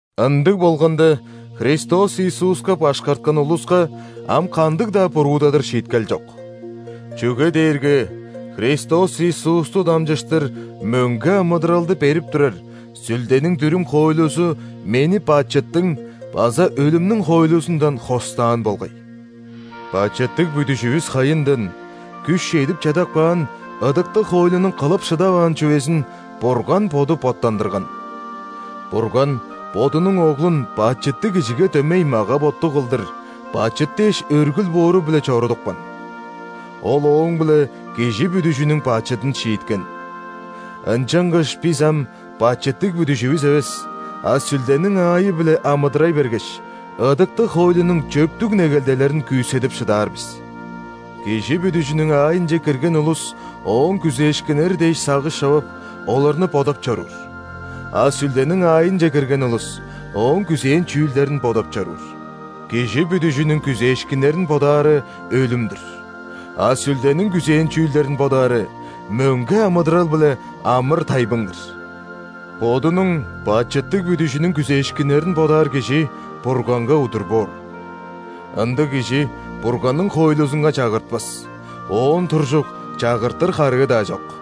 Ындыг болганда, Христос Иисуска башкарткан улуска ам кандыг-даа буруудадыр шииткел чок. Чүге дээрге Христос Иисусту дамчыштыр мөңге амыдыралды берип турар Сүлдениң дүрүм-хоойлузу мени бачыттың база өлүмнүң хоойлузундан хостаан болгай. Бачыттыг бүдүжүвүс хайындан күш чедип чадап каан ыдыктыг хоойлунуң кылып шыдаваан чүвезин Бурган Боду боттандырган. Бурган Бодунуң Оглун бачыттыг кижиге дөмей мага-боттуг кылдыр, бачыт дээш өргүл боору-биле чорудупкан. Ол ооң-биле кижи бүдүжүнүң бачыдын шииткен. Ынчангаш бис ам бачыттыг бүдүжүвүс эвес, а Сүлдениң аайы-биле амыдырай бергеш, ыдыктыг хоойлунуң чөптүг негелделерин күүседип шыдаар бис. Кижи бүдүжүнүң аайынче кирген улус ооң күзээшкиннери дээш сагыш човап, оларны бодап чоруур; а Сүлдениң аайынче кирген улус Ооң күзээн чүүлдерин бодап чоруур. Кижи бүдүжүнүң күзээшкиннерин бодаары – өлүм-дүр, а Сүлдениң күзээн чүүлдерин бодаары – мөңге амыдырал биле амыр-тайбың-дыр. Бодунуң бачыттыг бүдүжүнүң күзээшкиннерин бодаар кижи Бурганга удур боор. Ындыг кижи Бурганның хоойлузунга чагыртпас, оон туржук чагыртыр харыы-даа чок.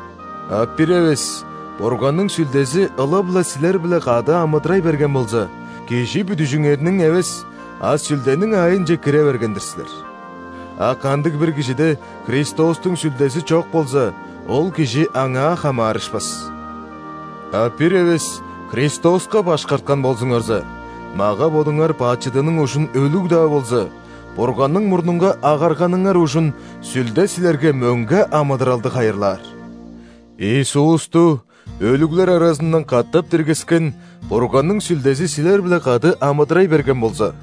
А бир эвес Бурганның Сүлдези ылап-ла силер-биле кады амыдырай берген болза, кижи бүдүжүңерниң эвес, а Сүлдениң аайынче кире берген-дир силер. А кандыг-бир кижиде Христостуң Сүлдези чок болза, ол кижи Аңаа хамаарышпас. А бир эвес Христоска башкарткан болзуңарза, мага-бодуңар бачыдының ужун өлүг-даа болза, Бурганның мурнунга агарганыңар ужун Сүлде силерге мөңге амыдыралды хайырлаар. Иисусту өлүглер аразындан катап диргискен Бурганның Сүлдези силер-биле кады амыдырай берген болза,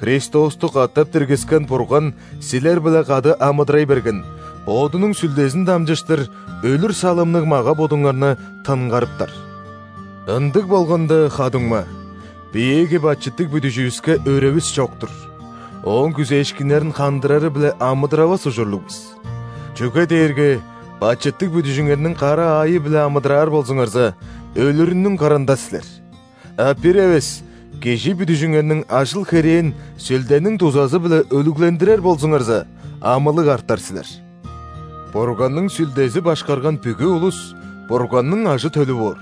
Христосту катап диргискен Бурган силер-биле кады амыдырай берген Бодунуң Сүлдезин дамчыштыр өлүр салымныг мага-бодуңарны тынгарыптар. Ындыг болганда, ха-дуңма, биеэги бачыттыг бүдүжүвүске өревис чок-тур, ооң күзээшкиннерин хандырары-биле амыдыравас ужурлуг бис. Чүге дээрге бачыттыг бүдүжүңерниң кара аайы-биле амыдыраар болзуңарза, өлүрүнүң кырында силер, а бир эвес кижи бүдүжүңерниң ажыл-херээн Сүлдениң дузазы-биле өлүглендирер болзуңарза, амылыг артар силер. Бурганның Сүлдези башкарган бүгү улус Бурганның ажы-төлү боор.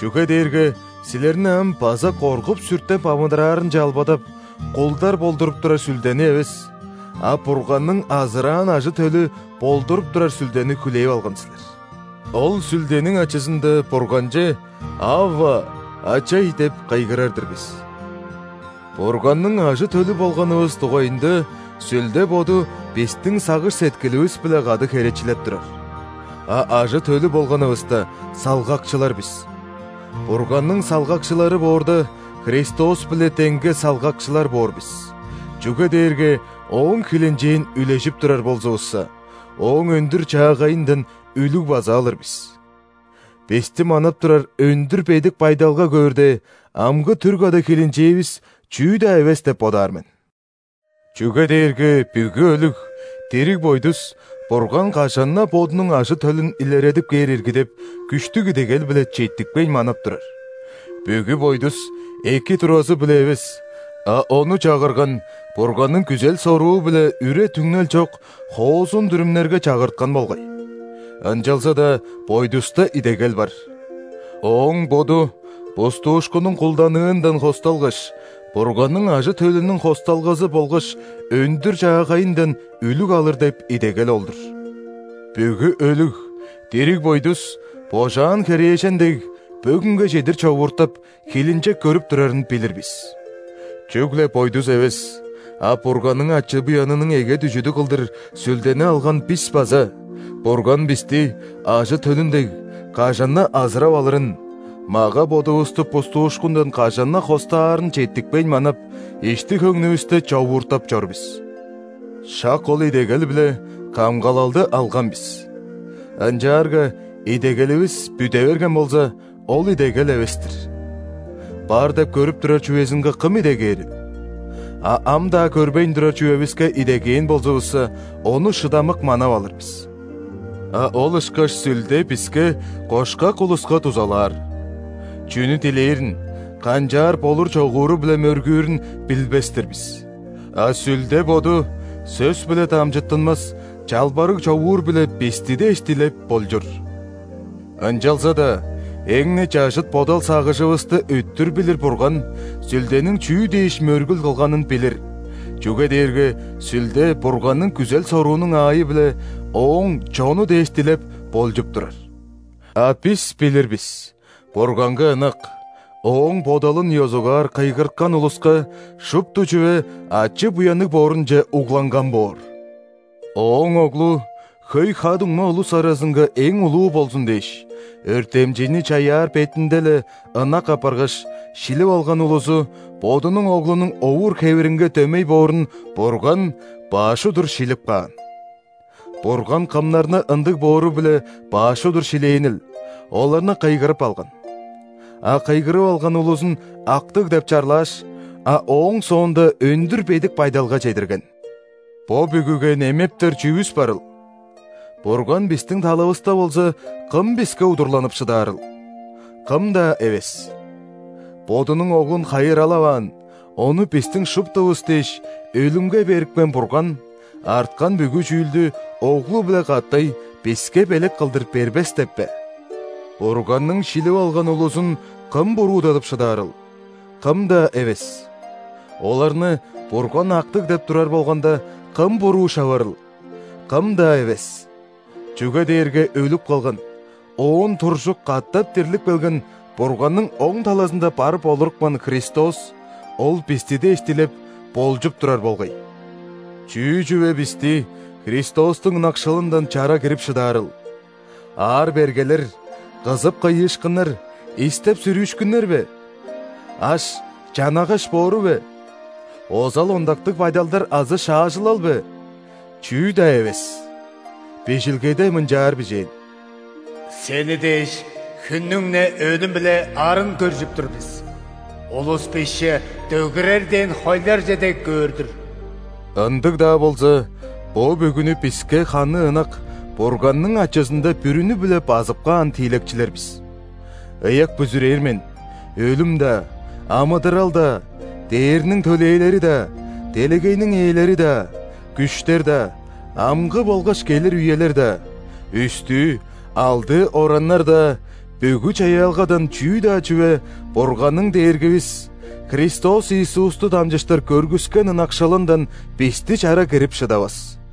Чүге дээрге силерни ам база коргуп-сүртеп амыдыраарынче албадап, кулдар болдуруп турар сүлдени эвес, а Бурганның азыраан ажы-төлү болдуруп турар Сүлдени хүлээп алган силер. Ол Сүлдениң ачызында Бурганче: «Авва! Ачай!» – деп кыйгырар-дыр бис. Бурганның ажы-төлү болганывыс дугайында Сүлде Боду бистиң сагыш-сеткиливис-биле кады херечилеп турар. А ажы-төлү болганывыста, салгакчылар бис. Бурганның салгакчылары боорда, Христос-биле деңге салгакчылар боор бис, чүге дээрге Ооң хилинчээн үлежип турар болзувусса, Ооң өндүр-чаагайындан үлүг база алыр бис. Бисти манап турар өндүр бедик байдалга көөрде, амгы түр када хилинчээвис чүү-даа эвес деп бодаар мен. Чүге дээрге бүгү өлүг, дириг бойдус, Бурган кажан-на Бодунуң ажы-төлүн илередип кээр ирги деп, күштүг идегел-биле четтикпейн манап турар. Бүгү бойдус эки туразы-биле эвес, а ону чагырган Бурганның күзел-соруу-биле үре-түңнел чок хоозун дүрүмнерге чагырткан болгай. Ынчалза-даа бойдуста идегел бар. Ооң боду бустуушкуннуң кулданыындан хосталгаш, Бурганның ажы-төлүнүң хосталгазы болгаш өндүр-чаагайындан үлүг алыр деп идегел ол-дур. Бүгү өлүг, дириг бойдус, божаан херээжен дег, бөгүнге чедир човууртап, хилинчек көрүп турарын билир бис. Чүгле бойдус эвес, а Бурганның ачы-буянының эге дүжүдү кылдыр Сүлдени алган бис база Бурган бисти, ажы-төлүн дег, кажан-на азырап алырын; мага-бодувусту бустуушкундан кажан-на хостаарын четтикпейн манап, ишти-хөңнүвүсте човууртап чор бис. Шак ол идегел-биле камгалалды алган бис. Ынчаарга идегеливис бүде берген болза, ол идегел эвес-тир. Бар деп көрүп турар чүвезинге кым идегээрил? А ам-даа көрбейн турар чүвевиске идегээн болзувусса, ону шыдамык манап алыр бис. А ол ышкаш Сүлде биске, кошкак улуска, дузалаар. Чүнү дилээрин, канчаар болур-чогууру-биле мөргүүрүн билбес-тир бис, а Сүлде Боду сөс-биле дамчыттынмас чалбарыг-човуур-биле бисти дээш дилеп, болчур. Ынчалза-даа эң-не чажыт бодал-сагыжывысты өттүр билир Бурган Сүлдениң чүү дээш мөргүл кылганын билир, чүге дээрге Сүлде Бурганның күзел-соруунуң аайы-биле Ооң чону дээш дилеп, болчуп турар. А бис билир бис: Бурганга ынак, Ооң бодалын ёзугаар кыйгырткан улуска шупту чүве ачы-буянныг боорунче угланган боор. Ооң Оглу хөй ха-дуңма улус аразынга эң улуу болзун дээш, өртемчейни чаяар бетинде-ле ынак апаргаш, шилип алган улузу Бодунуң Оглунуң овур-хевиринге дөмей боорун Бурган баш удур шилип каан. Бурган кымнарны ындыг боору-биле баш удур шилээнил, оларны кыйгырып алган. А кыйгырып алган улузун актыг деп чарлааш, а ооң соонда өндүр бедик байдалга чедирген. – Бо бүгүге немептер чүвүс барыл? Бурган бистиң талавыста болза, кым биске удурланып шыдаарыл? – Кым-даа эвес! Бодунуң Оглун хайыралаваан, Ону бистиң шуптувус дээш, өлүмге берипкен Бурган арткан бүгү чүүлдү Оглу-биле катай биске белек кылдыр бербес деп бе? – Бурганның шилип алган улузун кым буруудадып шыдаарыл? – Кым-даа эвес! Оларны Бурган актыг деп турар болганда, кым буруу шаварыл? – Кым-даа эвес! Чүге дээрге өлүп калган, оон туржук катап дирлип келген, Бурганның оң талазында барып олурупкан Христос – Ол бисти дээш дилеп, болчуп турар болгай. – Чүү чүве бисти Христостуң ынакшылындан чара кирип шыдаарыл? Аар-бергелер, кызып-кыйыышкыннар, истеп-сүрүүшкүннер бе? Аш, чанагаш боору бе? Озал-ондактыг байдалдар азы шаажылал бе? – Чүү-даа эвес! Бижилгеде мынчаар бижээн:«Сени дээш, хүннүң-не өлүм-биле арын көржүп тур бис,улус бисче, дөгерер дээн хойларже дег, көөр-дүр». Ындыг-даа болза, бо бүгүнү биске ханы ынак Бурганның ачызында бүрүнү-биле базып каан тиилекчилер бис. Ыяк бүзүрээр мен: өлүм-даа, амыдырал-даа, ·дээрниң төлээлери-даа, делегейниң ээлери-даа, күштер-даа, амгы болгаш келир үелер-даа, үстүү, алдыы ораннар-даа – бүгү чаяалгадан чүү-даа чүве Бурганның Дээргивис Христос Иисусту дамчыштыр көргүскен ынакшылындан бисти чара кирип шыдавас.